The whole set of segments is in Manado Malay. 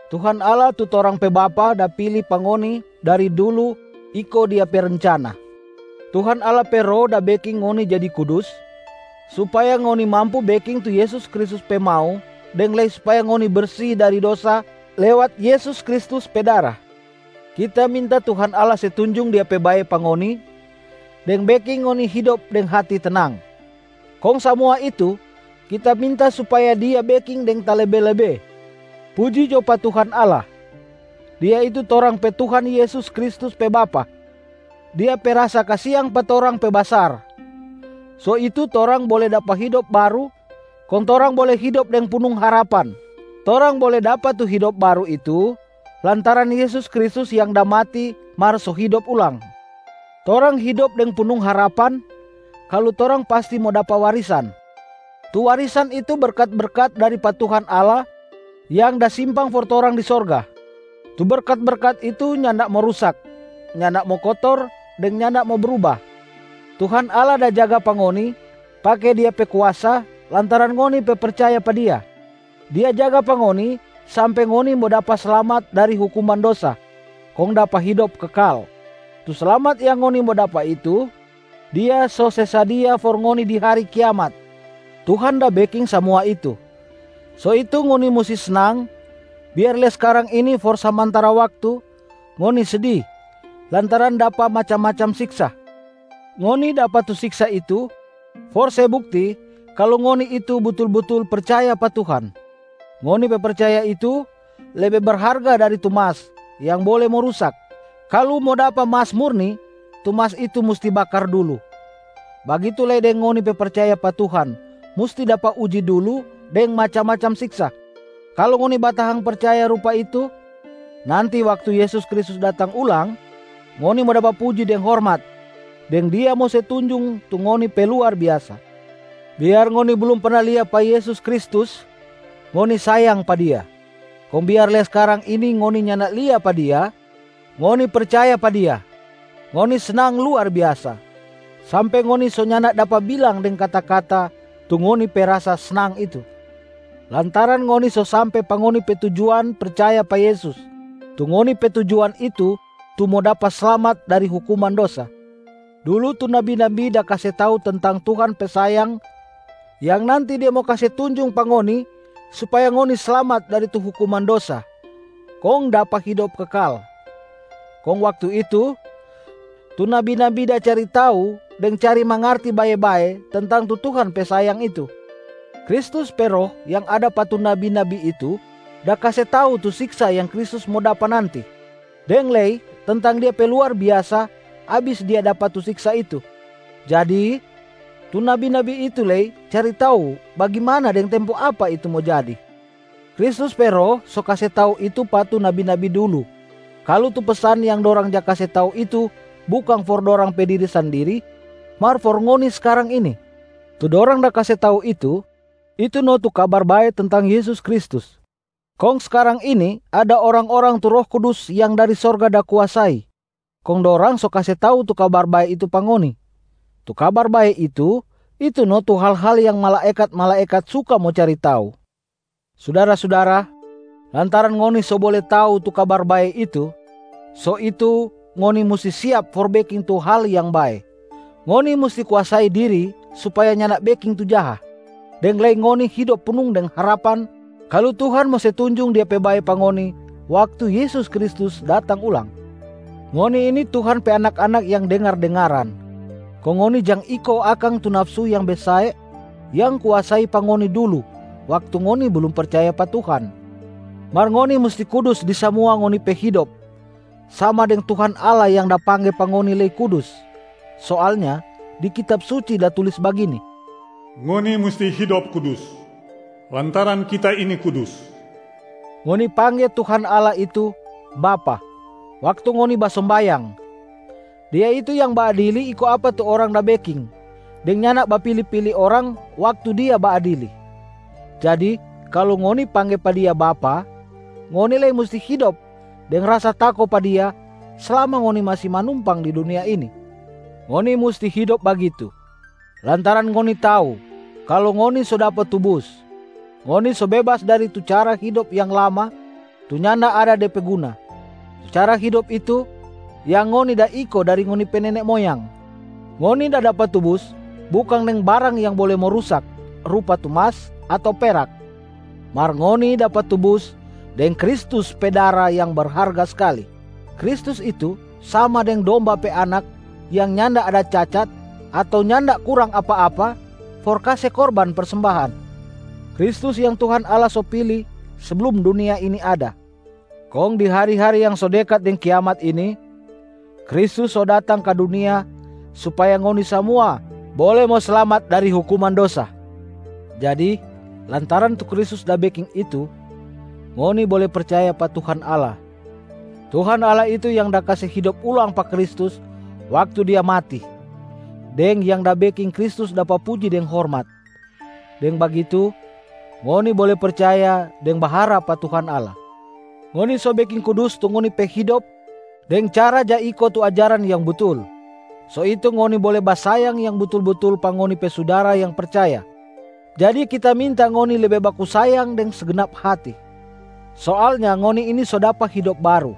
Tuhan Allah tu torang pe Bapa da pili pa ngoni dari dulu iko Dia pe rencana. Tuhan Allah pe Roh da beking ngoni jadi kudus supaya ngoni mampu beking tu Yesus Kristus pe mau deng lei supaya ngoni bersi dari dosa lewat Yesus Kristus pe dara. Kita minta Tuhan Allah se tunjung Dia pe bae pa ngoni deng beking ngoni hidop deng hati tenang, kong samua itu kita minta supaya Dia beking deng talebe-lebe. Puji jo pa Tuhan Allah, Dia itu torang pe Tuhan Yesus Kristus pe Bapa. Dia pe rasa kasiang pa torang pe basar, so itu torang bole dapa hidop baru kong torang bole hidop deng punung harapan. Torang bole dapa tu hidop baru itu lantaran Yesus Kristus yang da mati mar so hidop ulang. Torang hidop deng punung harapan kalu torang pasti mo dapa warisan, tu warisan itu berkat-berkat dari pa Tuhan Allah yang da simpang for torang di sorga. Tu berkat-berkat itu nyanda mo rusak, nyanda mo kotor deng nyanda mo bruba. Tuhan Allah da jaga pa ngoni pake Dia pe kuasa lantaran ngoni pe percaya pa Dia. Dia jaga pa ngoni sampe ngoni mo dapa slamat dari hukuman dosa kong dapa hidop kekal. Tu slamat yang ngoni mo dapa itu Dia so se sadia for ngoni di hari kiamat. Tuhan da beking samua itu, so itu ngoni musti snang biar lei skarang ini for samantara waktu ngoni sedi lantaran dapa macam-macam siksa. Ngoni dapa tu siksa itu for se bukti kalu ngoni itu butul-butul percaya pa Tuhan. Ngoni pe percaya itu lebe berharga dari tu mas yang bole mo rusak. Kalu mo dapa mas murni, tu mas itu musti bakar dulu, bagitu lei deng ngoni pe percaya pa Tuhan musti dapa uji dulu deng macam-macam siksa. Kalu ngoni batahang percaya rupa itu, nanti waktu Yesus Kristus datang ulang, ngoni mo dapa puji deng hormat, deng Dia mo se tunjung tu ngoni pe luar biasa. Biar ngoni blum perna lia pa Yesus Kristus, ngoni sayang pa Dia. Kong biar lei skarang ini ngoni nyanda lia pa Dia, ngoni percaya pa Dia. Ngoni snang luar biasa, sampe ngoni so nyanda dapa bilang deng kata-kata tu ngoni pe rasa snang itu, lantaran ngoni so sampe pa ngoni pe tujuan percaya pa Yesus. Tu ngoni pe tujuan itu tu mo dapa slamat dari hukuman dosa. Dulu tu nabi-nabi da kase tau tentang Tuhan pe sayang yang nanti Dia mo kase tunjung pa ngoni supaya ngoni slamat dari tu hukuman dosa kong dapa hidop kekal. Kong waktu itu, tu nabi-nabi da cari tau deng cari mangarti bae-bae tentang tu Tuhan pe sayang itu. Kristus pe Roh yang ada pa tu nabi-nabi itu da kase tau tu siksa yang Kristus mo dapa nanti, deng lei tentang Dia pe luar biasa abis Dia dapa tu siksa itu. Jadi, tu nabi-nabi itu lei cari tau bagimana deng tempo apa itu mo jadi. Kristus pe Roh so kase tau itu pa tu nabi-nabi dulu kalu tu pesan yang dorang ja kase tau itu bukang for dorang pe diri sandiri mar for ngoni skarang ini. Tu dorang da kase tau itu, itu no tu Kabar Bae tentang Yesus Kristus. Kong skarang ini ada orang-orang tu Roh Kudus yang dari sorga da kuasai, kong dorang so kase tau tu Kabar Bae itu pa ngoni. Tu Kabar Bae itu, itu no tu hal-hal yang malaekat-malaekat suka mo cari tau. Sudara-sudara, lantaran ngoni so bole tau tu Kabar Bae itu, so itu ngoni musti siap for beking tu hal yang bae, ngoni musti kuasai diri supaya nyanda beking tu jaha, deng lei ngoni hidop punung deng harapan kalu Tuhan mo se tunjung Dia pe bae pa ngoni waktu Yesus Kristus datang ulang. Ngoni ini Tuhan pe anak-anak yang dengar-dengaran, kong ngoni jang iko akang tu nafsu yang besae yang kuasai pa ngoni dulu waktu ngoni blum percaya pa Tuhan. Mar ngoni musti kudus di samua ngoni pe hidop sama deng Tuhan Allah yang da pangge pa ngoni lei kudus. Soalnya di Kitab Suci da tulis bagini, “Ngoni musti hidop kudus, lantaran Kita ini kudus.” Ngoni pangge Tuhan Allah itu ‘Bapa’ waktu ngoni basombayang. Dia itu yang baadili iko apa tu orang da beking deng nyanda bapili-pili orang waktu Dia baadili. Jadi kalu ngoni pangge pa Dia ‘Bapa’, ngoni lei musti hidop deng rasa tako pa Dia slama ngoni masi manumpang di dunia ini. Ngoni musti hidop bagitu lantaran ngoni tau kalu ngoni so dapa tubus, ngoni so bebas dari tu cara hidop yang lama tu nyanda ada de pe guna. Tu cara hidop itu yang ngoni da iko dari ngoni pe nene moyang. Ngoni da dapa tubus bukang deng barang yang bole mo rusak rupa tu mas ato perak, mar ngoni dapa tubus deng Kristus pe dara yang berharga skali. Kristus itu sama deng domba pe anak yang nyanda ada cacat ato nyanda kurang apa-apa for kase korban persembahan. Kristus yang Tuhan Allah so pili seblum dunia ini ada. Kong di hari-hari yang so dekat deng kiamat ini, Kristus so datang ka dunia supaya ngoni samua bole mo slamat dari hukuman dosa. Jadi lantaran tu Kristus da beking itu, ngoni bole percaya pa Tuhan Allah. Tuhan Allah itu yang da kase hidop ulang pa Kristus waktu Dia mati, deng yang da beking Kristus dapa puji deng hormat. Deng bagitu, ngoni bole percaya deng baharap pa Tuhan Allah. Ngoni so beking kudus tu ngoni pe hidop deng cara ja iko tu ajaran yang butul, so itu ngoni bole basayang yang butul-butul pa ngoni pe sudara yang percaya. Jadi kita minta ngoni lebe baku sayang deng segnap hati. Soalnya ngoni ini so dapa hidop baru.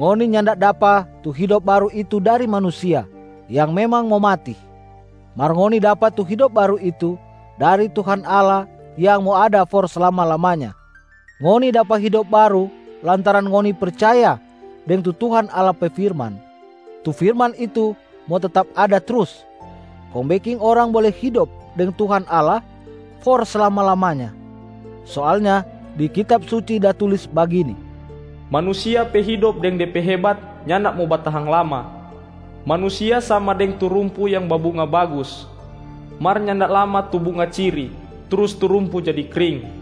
Ngoni nyanda dapa tu hidop baru itu dari manusia yang memang mo mati, mar ngoni dapa tu hidop baru itu dari Tuhan Allah yang mo ada for slama-lamanya. Ngoni dapa hidop baru lantaran ngoni percaya deng tu Tuhan Allah pe firman. Tu firman itu mo tetap ada trus kong beking orang bole hidop deng Tuhan Allah for slama-lamanya. Soalnya di Kitab Suci da tulis bagini, “Manusia pe hidop deng de pe hebat nyanda mo batahang lama. Manusia sama deng tu rumpu yang babunga bagus, mar nyanda lama tu bunga ciri trus tu rumpu jadi kring,